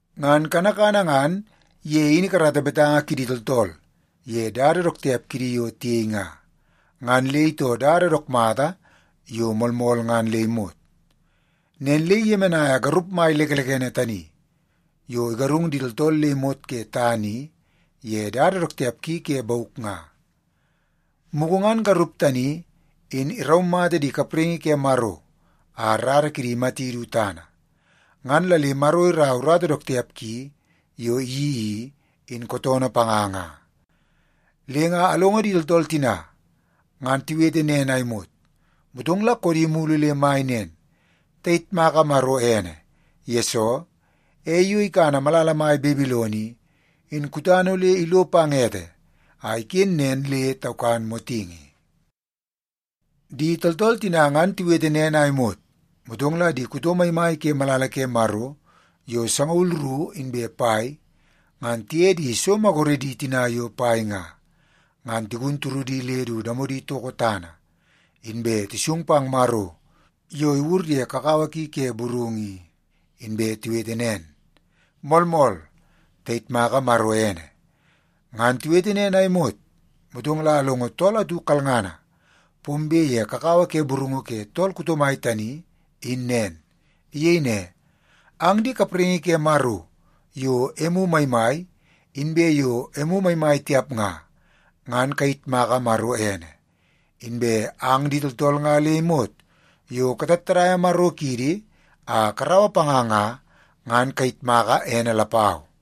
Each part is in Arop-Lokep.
Ngan kanakana ngan ye in ikarata betanga kidi tooltool ye dada dook tiap kidi yo tiyei nga, ngan le itoo dada dook mata yo moolmool ngan le imot. Nen le iyemenaia garup mai lekelekene tani yo igarung di tooltool le imot ke tana i ye dada dook tiap ki ke bauk nga. Mugu ngan garup tani in iraumata di kapraingi ke Maro a rara kidi imati du tana, ngan la le Maro iraua urata dook tiap ki yo iyeii i, in kootoonoo panga nga.” Le nga alongo di tooltool tina ngan tiwete nen a imot, motong la koodi mulu le mai nen, “Tayitmaka Maro ene! Yesoo, ei yo ikana malala mai Babilon i, in kutana ole ilo pang ete a iken nen le taukan motingi.” Di tooltool tina ngan tiwete nen a imot, motong la di kuto maimai ke malala ke Maro yo sangaul ru inbe pai ngan tiye di so maguredi tina yo pai nga, ngan tigun turudi le du damodi toko tana, inbe tisung pang Maro yo iwur ye kakawa ki ke burungu i. Inbe tiwete nen, “Moolmool, tayitmaka Maro ene!” Ngan tiwete nen a imot, motong la alongo tool atu kalngana pombe ye kakawa ke burungu ke tool kuto mai tani in nen. Iyei ne, “Ang di kapraingi ke Maro yo emu maimai inbe yo emu maimai tiap nga, ngan kayitmaka Maro ene! Inbe ang di tooltool nga le imot yo katattadaia Maro kiidi a karaua panga nga, ngan kayitmaka ene lapau!”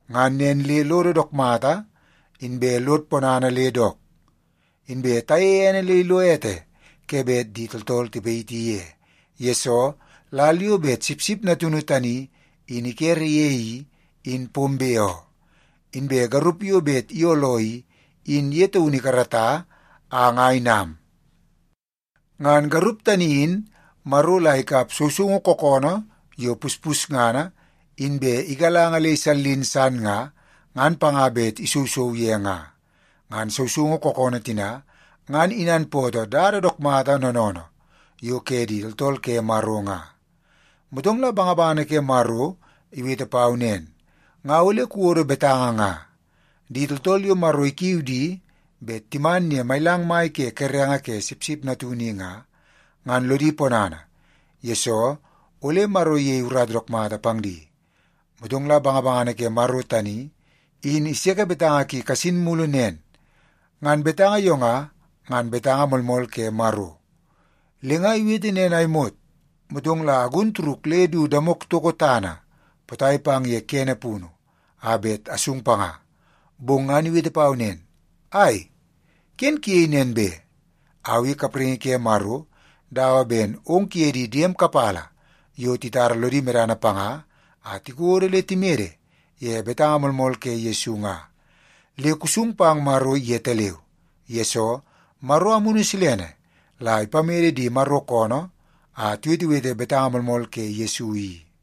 Ngan nen le lodo dook mata inbe lod ponana le dook. Inbe tayeie ene le ilo ete ke bet di tooltool tipayiti ye. Yesoo, lal yo bet Sipsip Natunu tani in ikere ye i, in pombe oo. Inbe garup yo bet iyooloo i, in ye taunu ikarata a nga inam. Ngan garup tani in Maro la ikap sousoungu kookoonoo yo puspusngana inbe igalanga le isallin san nga, ngan panga bet isousou ye nga.” Ngan sousoungu kookoonoo tina ngan inanpootoo dada dook mata noonoonoo yo ke di tooltool ke Maro nga. Motong la bangabangana ke Maro iwete pau nen, “Nga ole kuwodo betanga nga: ‘Di tooltool yo Maro ikiu di bet timan ye mailang mai ke kerenge ke Sipsip Natunu i nga, ngan lodi ponana, yesoo ole Maro iyei urata dook mata pang di.’” Motong la bangabangana ke Maro tani in iseke betanga ki kasin mulu nen, “Ngan betanga yo nga, ngan betanga moolmool ke Maro.” Le nga iwete nen a imot, motong la agun turuk le du damok itoko tana potai pang ye kene punu a bet asung panga. Bong ngan iwete pau nen, “Ai, ken kuyei nen be! Au i kapraingi ke Maro dawa ben ong kuye di diem kapala yo titara lodi medana panga a tikodo le timede ye betanga moolmool ke Yesu nga. Le kusung pang Maro yetaleu! Yesoo, Maro Amunu Silene la ipamede di Maro koonoo a tiwetewete betanga moolmool ke Yesu i.”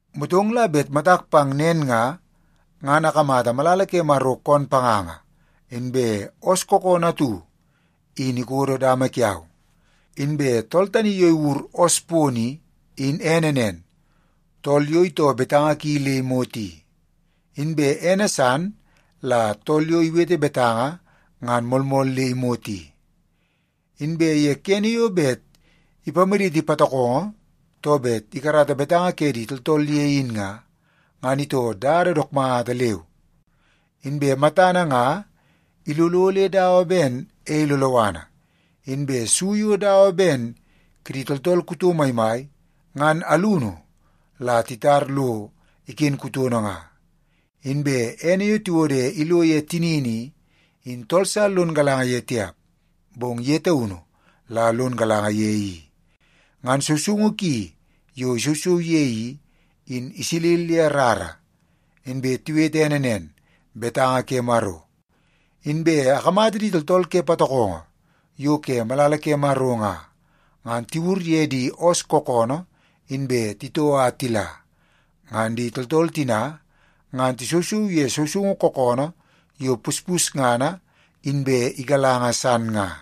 Motong la bet matak pang nen nga, ngan akamata malala ke Maro koon panganga inbe oos kookoonoo atu in ikodo dama kiau. Inbe tool tani yo iwur oos pono i, in ene nen, Tool Yo Itoo Betanga Ki Le Imot i. Inbe ene san la Tool Yo Iwete Betanga Ngan Moolmool Le Imot i. Inbe ye kene yo bet ipamaditi patokongo too bet ikarata betanga ke di tooltool ye in nga, ngan itoo dada dook mata leu. Inbe matana nga ilolo le dawa ben ei loloana, inbe su yo dawa ben kidi tooltool kuto maimai, ngan alunu la titar lo iken kutono nga. Inbe ene yo tiwode ilo ye tinini i, in tool sa lono galanga ye tiap, bong ye taunu la lon galanga ye i. Ngan sousoungu ki yo isousou ye i, in isilil ye rara. Inbe tiwete ene nen, Betanga ke Maro. Inbe akamata di tooltool ke patokongo yo ke malala ke Maro nga, ngan tiwur ye di oos kookoonoo inbe titoo a tila. Ngan di tooltool tina ngan tisousou ye sousoungu kookoonoo yo puspusngana inbe igalanga san nga.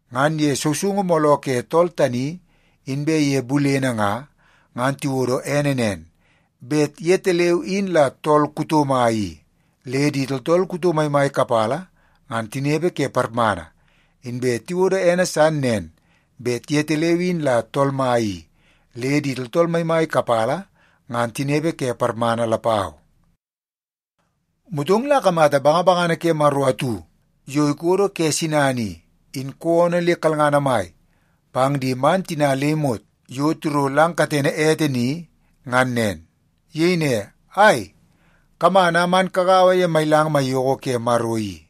Ngan ye sousoungu mooloo ke tool tani inbe ye bulene nga, ngan tiwodo ene nen, bet yetaleu in la Tool Kuto Mai i, le di tooltool kuto maimai kapala ngan tinepe ke parmana. Inbe tiwodo ene san nen bet yetaleu in la Tool Mai i, le di tooltool maimai kapala ngan tinepe ke parmana lapau. Motong la akamata bangabangana ke Maro atu yo ikodo ke sinana i, in koonoo le kalngana mai pang di man tina le imot yo tiro lang katene ete ni ngan nen. Iyei ne, “Ai, kaman a man kagaua ye mailang maiyoko ke Maro i,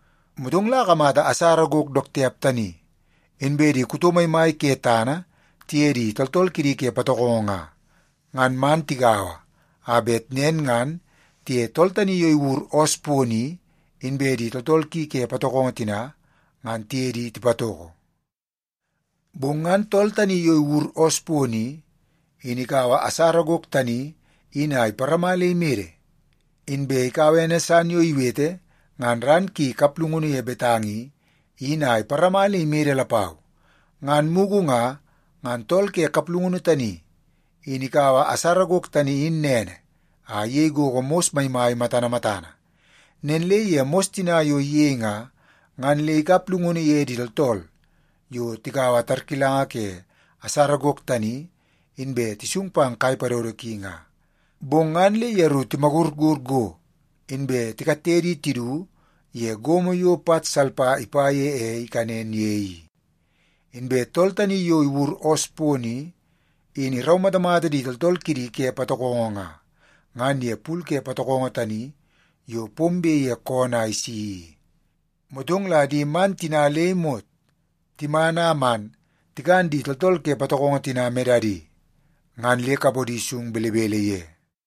Motong la akamata asara gok dook tiap tani, inbe di kuto maimai ke tana tiye di tooltool kidi ke patokongo nga, ngan man tigaua a bet nen ngan tiye tool tani yo iwur oos pono i, inbe di tooltool ki ke patokongo tina, ngan tiye di tipatoko. Bong ngan tool tani yo iwur oos pono i, in ikaua asara gok tani in a iparama le imede. Inbe ikaua ene san yo iwete ngan ran ki kaplungunu ye betanga i, in a iparama le imede lapau. Ngan mugu nga, ngan tool ke kaplungunu tani in ikaua asara gok tani in nene a iyei gogo mos maimai matana matana. Nen le ye mos tina yo iyei nga, ngan le ikap llungunu ye di tooltool yo tikaua tarkilanga ke asara gok tani inbe tisung pang kai padodo ki nga. Bong ngan le yeru timagurgur go, inbe tikatte di tidu ye gomo yo pat salpa ipa ye ei ikanen ye i. Inbe tool tani yo iwur oos pono i, in iraumatamata di tooltool kidi ke patokongo nga, ngan ye pul ke patokongo tani yo pombe ke koonoo a isi i. Motong la di man tina le imot timan a man tikan di tooltool ke patokongo tina medadi, ngan le kapodi sung belebele ye.